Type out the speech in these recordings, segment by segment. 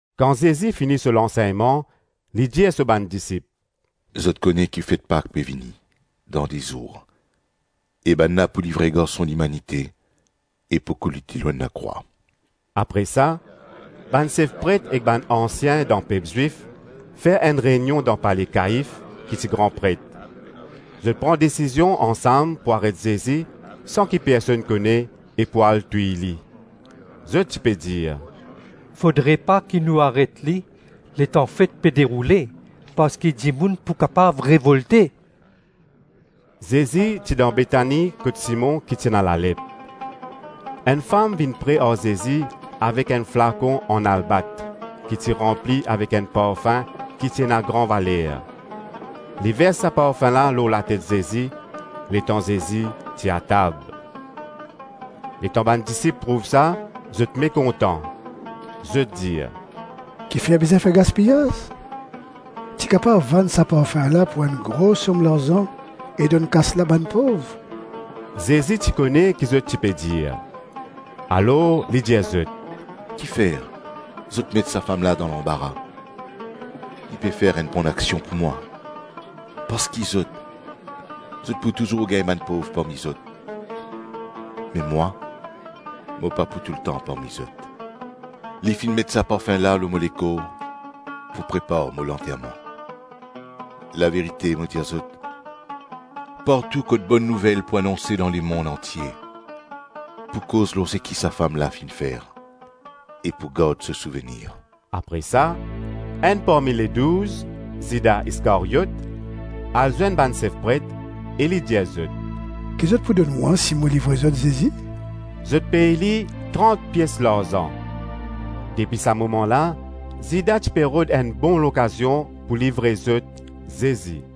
Kan Zezi fini so lansegnman, li dir so bann disip, “Zot kone ki fet Pak pe vini dan de zour e bann la pou livre Garson Limanite e pou koulout li lor enn lakrwa.” Apre sa, bann sef pret ek bann ansien dan pep Zwif fer enn reynion dan pale Kaif, ki ti gran pret. Zot pran desizion ansam pou aret Zezi san ki personn kone e pou al touy li. Zot ti pe dir, “Fodre pa ki nou aret li letan fet pe deroule parski dimoun pou kapav revolte.” Zezi ti dan Betani kot Simon ki ti ena lalep. Enn fam vinn pre ar Zezi avek enn flakon an albat ki ti ranpli avek enn parfin ki ti ena gran valer; li vers sa parfin la lor latet Zezi, letan Zezi ti atab. Letan bann disip trouv sa, zot mekontan. Zot dir, “Kifer bizin fer gaspiyaz? Ti kapav vann sa parfin la pou enn gro som larzan e donn kas la bann pov!” Zezi ti kone ki zot ti pe dir, alor li dir zot, “Kifer zot met sa fam la dan lanbara; li pe fer enn bonaksion pou mwa. Parski zot, zot pou touzour gagn bann pov parmi zot me mwa, mo pa pou toultan parmi zot. Li finn met sa parfin la lor mo lekor pou prepar mo lanterman. Laverite mo dir zot, partou kot Bonn Nouvel pou anonse dan lemonn antie, pou koz lor seki sa fam la finn fer e pou gard so souvenir.” Apre sa, enn parmi Ledouz, Zida Iskaryot, al zwenn bann sef pret e li dir zot, “Ki zot pou donn mwa si mo livre zot Zezi?” Zot pey li trant pies larzan. Depi sa moman la, Zida ti pe rod enn bon lokazion pou livre zot Zezi.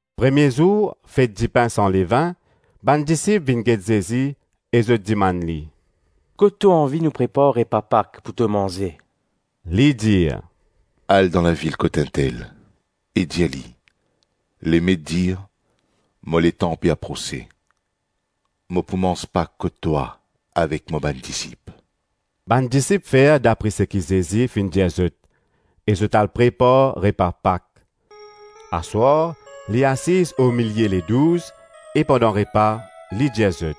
Premie zour fet dipin san levin, bann disip vinn get Zezi e zot dimann li, “Kot to anvi nou prepar repa Pak pou to manze?” Li dir, “Al dan lavil kot intel, e dir li, ‘Lemet dir, mo letan pe aprose; mo pou manz Pak kot twa avek mo bann disip.’” Bann disip fer dapre seki Zezi finn dir zot e zot al prepar repa Pak. Aswar, li asiz omilie Ledouz, e pandan repa li dir zot,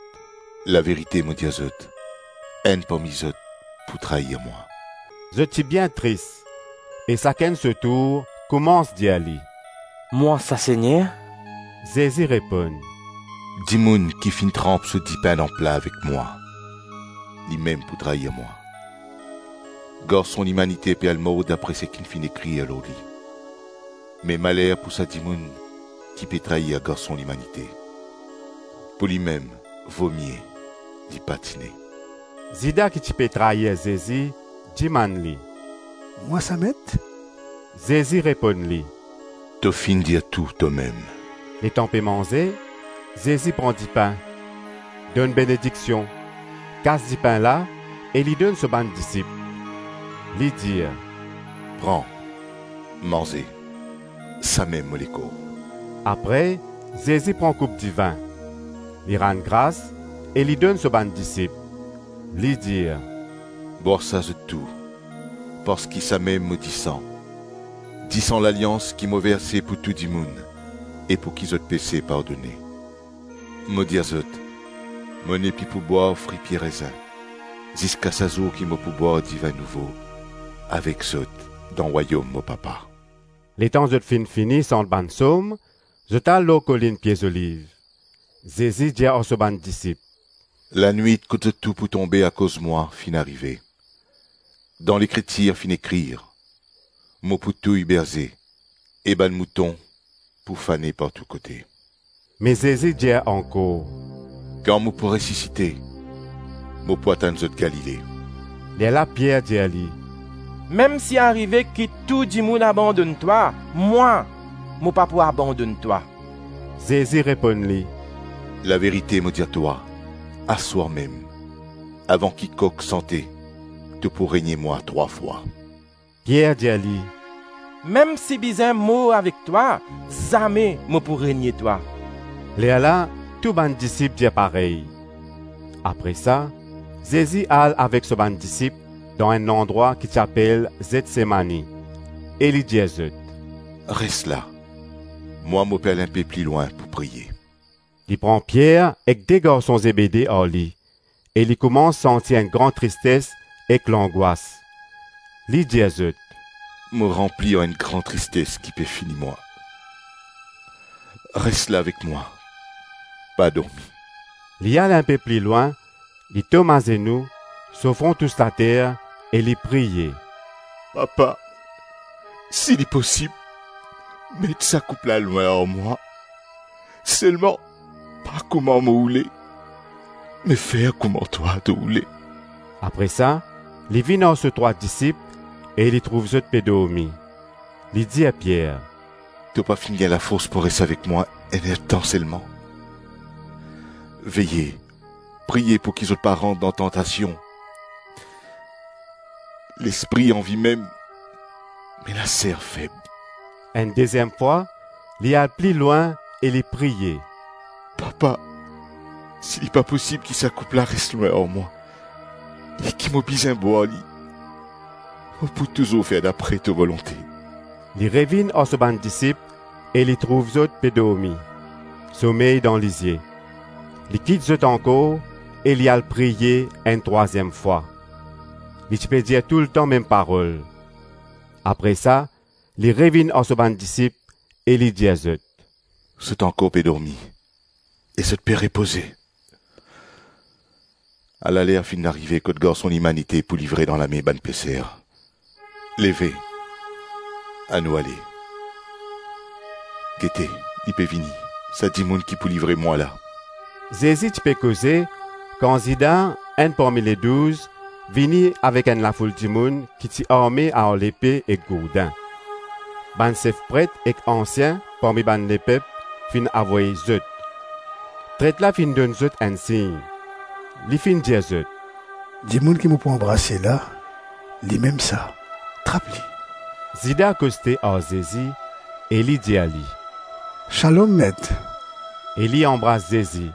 “Laverite mo dir zot, enn parmi zot pou trair mwa.” Zot ti bien tris e sakenn so tour koumans dir li, “Mwa sa Segner?” Zezi reponn, “Dimoun ki finn tranp so dipin dan pla avek mwa, limem pou trair mwa. Garson Limanite pe al mor dapre seki finn ekrir lor li, me maler pou sa dimoun ki pe trair Garson Limanite! Pou limem vomie, li pa ti ne.” Zida ki ti pe trair Zezi dimann li, “Mwa sa Met?” Zezi reponn li, “To finn dir tou tomem.” Letan pe manze, Zezi pran dipin, donn benediksion, kas dipin la e li donn so bann disip. Li dir, “Pran, manze, samem mo lekor.” Apre Zezi pran koup divin, li rann gras e li donn so bann disip, li dir, “Bwar sa zot tou, parski samem mo disan, disan lalians ki mo verse pou tou dimoun e pouki zot pese pardone. Mo dir zot, mo nepli pou bwar fri pie rezin ziska sa zour ki mo pou bwar divin nouvo avek zot dan Rwayom mo Papa.” Letan zot finn fini sant bann Psom, zot al lor kolinn Pie Zoliv. Zezi dir ar so bann disip, “Lanwit kot zot tou pou tonbe akoz mwa finn arive. Dan Lekritir finn ekrir, ‘Mo pou touy berze, e bann mouton pou fane partou kote.’” Me Zezi dir ankor, “Kan mo pou resisite, mo pou atann zot Galile.” Lerla Pier dir li, “Mem si arive ki tou dimoun abandonn twa, mwa, mo pa pou abandonn twa.” Zezi reponn li, “Laverite mo dir twa, aswar mem, avan ki kok sante, to pou renie mwa trwa fwa.” Pier dir li, “Mem si bizin mor avek twa, zame mo pou renie twa.” Lerla tou bann disip dir parey. Apre sa, Zezi al avek so bann disip dan enn landrwa ki ti apel Zetsemani e li dir zot, “Res la, mwa mo pe al inpe pli lwin pou priye.” Li pran Pier ek de garson Zebede ar li e li koumans santi enn gran tristes ek langwas. Li dir zot, “Mo ranpli ar enn gran tristes ki pe fini mwa. Res la avek mwa, pa dormi.” Li al inpe pli lwin, li tom azenou, so fron tous later e li priye, “Papa, si li posib, met sa koup la lwin ar mwa, selman pa kouma mo oule me fer kouma twa to oule.” Apre sa, li vinn ar so trwa disip e li trouv zot pe dormi. Li dir Pier, “To pa finn gagn lafors pou res avek mwa enn-ertan selman? Veye, priye pouki zot pa rant dan tantasion. Lespri anvi mem, me laser feb.” Enn deziem fwa, li al pli lwin e li priye, “Papa, si li pa posib ki sa koup la res lwin ar mwa e ki mo bizin bwar li, mo pou touzour fer dapre to volonte.” Li revinn ar so bann disip e li trouv zot pe dormi, somey dan lizie. Li kit zot ankor e li al priye enn trwaziem fwa. Li ti pe dir toultan mem parol. Apre sa, li revinn ar so bann disip e li dir zot, “Zot ankor pe dormi e zot pe repoze. Ala ler finn arive kot Garson Limanite pou livre dan lame bann peser. Leve, anou ale! Gete, li pe vini, sa dimoun ki pou livre mwa la.” Zezi ti pe koze, kan Zida, enn parmi Ledouz, vini avek enn lafoul dimoun ki ti arme ar lepe ek gourdin. Bann sef pret ek ansien parmi bann lepep finn avoy zot. Tret la finn donn zot enn sign; li finn dir zot, “Dimoun ki mo pou anbrase la, limem sa, trap li.” Zida koste ar Zezi e li dir li, “Shalom Met.” E li anbras Zezi.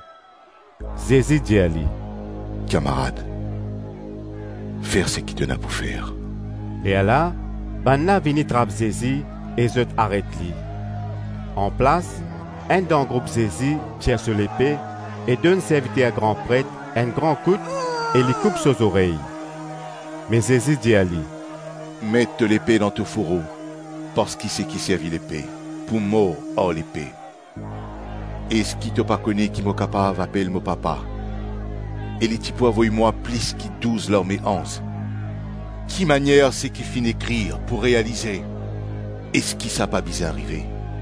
Zezi dir li, “Kamarad, fer seki to ena pou fer.” Lerla bann la vini trap Zezi e zot aret li. Anplas, enn dan group Zezi tir so lepe e donn serviter gran pret enn gran kout e li koup so zorey. Me Zezi dir li, “Met to lepe dan to fouro parski seki servi lepe pou mor ar lepe. Eski to pa kone ki mo kapav apel mo Papa e li ti pou avoy mwa plis ki douz larme anz? Kimanier seki finn ekrir pou realize? Eski sa pa bizin arive?”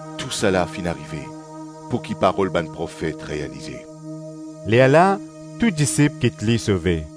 Tousala finn arive pouki parol bann profet realize.” Lerla tou disip kit li sove.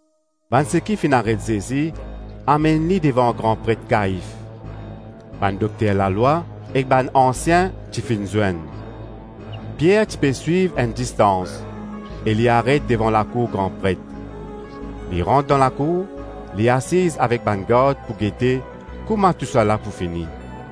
Bann seki finn aret Zezi amenn li devan gran pret Kaif. Bann dokter lalwa ek bann ansien ti finn zwenn. Pier ti pe swiv enn distans e li aret devan lakour gran pret. Li rant dan lakour, li asiz avek bann gard pou gete kouma tousala pou fini.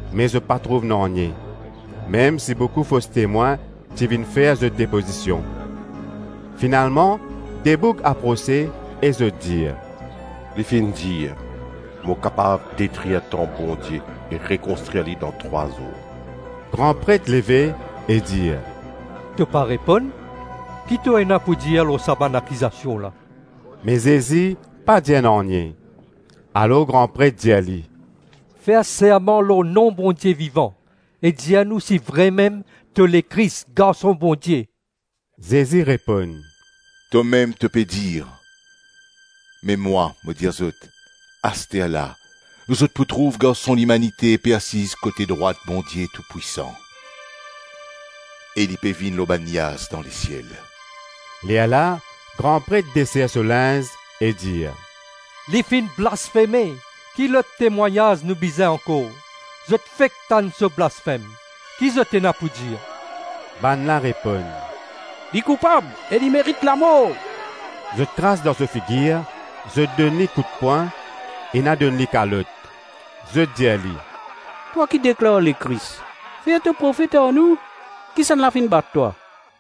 me zot pa trouv nanye, mem si boukou fos temwin ti vinn fer zot depozision. Finalman de boug aprose e zot dir, “Li finn dir, ‘Mo kapav detrir tanp Bondie e rekonstrir li dan trwa zour.’” Gran pret leve e dir, “To pa reponn? Ki to ena pou dir lor sa bann akizasion la?” Me Zezi pa dir nanye. Alor gran pret dir li, “Fer serman lor nom Bondie Vivan e dir nou si vremem to Lekris, Garson Bondie.” Zezi reponn, “Tomem to pe dir; me mwa, mo dir zot, asterla zot pou trouv Garson Limanite pe asiz kote drwat Bondie Toupwisan, e li pe vinn lor bann niaz dan lesiel.” Lerla gran pret desir so linz e dir, “Li finn blasfeme. Ki lot temwagnaz nou bizin ankor? Zot fek tann so blasfem. Ki zot ena pou dir?” Bann la reponn, “Li koupab e li merit lamor.” Zot kras dan so figir, zot donn li koutpwin, ena donn li kalot. Zot dir li, “Twa ki deklar Lekris, fer to profet ar nou, kisannla finn bat twa?”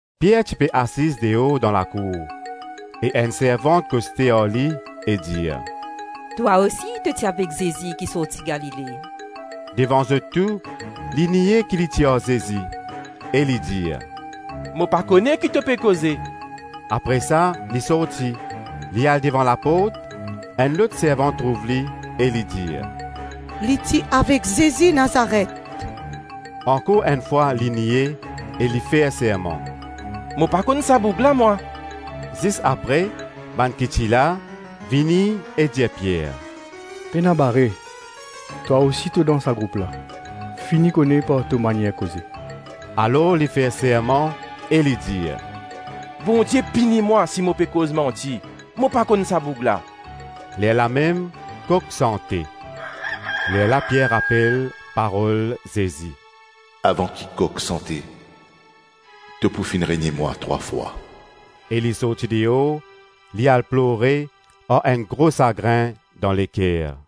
Pier ti pe asiz deor dan lakour e enn servant koste ar li e dir, “Twa osi to ti avek Zezi ki sorti Galile.” Devan zot tou, li nie ki li ti ar Zezi e li dir, “Mo pa kone ki to pe koze.” Apre sa li sorti, li al devan laport. Enn lot servant trouv li e li dir, “Li ti avek Zezi Nazaret.” Ankor enn fwa li nie e li fer serman, “Mo pa konn sa boug la mwa.” Zis apre, bann ki ti la, vini e dir Pier, “Pena bare, twa osi to dan sa group la; fini kone par to manier koze.” Alor li fer serman e li dir, “Bondie pini mwa si mo pe koz manti, mo pa konn sa boug la.” Lerlamem, kok sante. Lerla Pier rapel parol Zezi, ‘Avan ki kok sante, to pou finn renie mwa trwa fwa,’ - e li sorti deor, li al plore ar enn gro sagrin dan leker.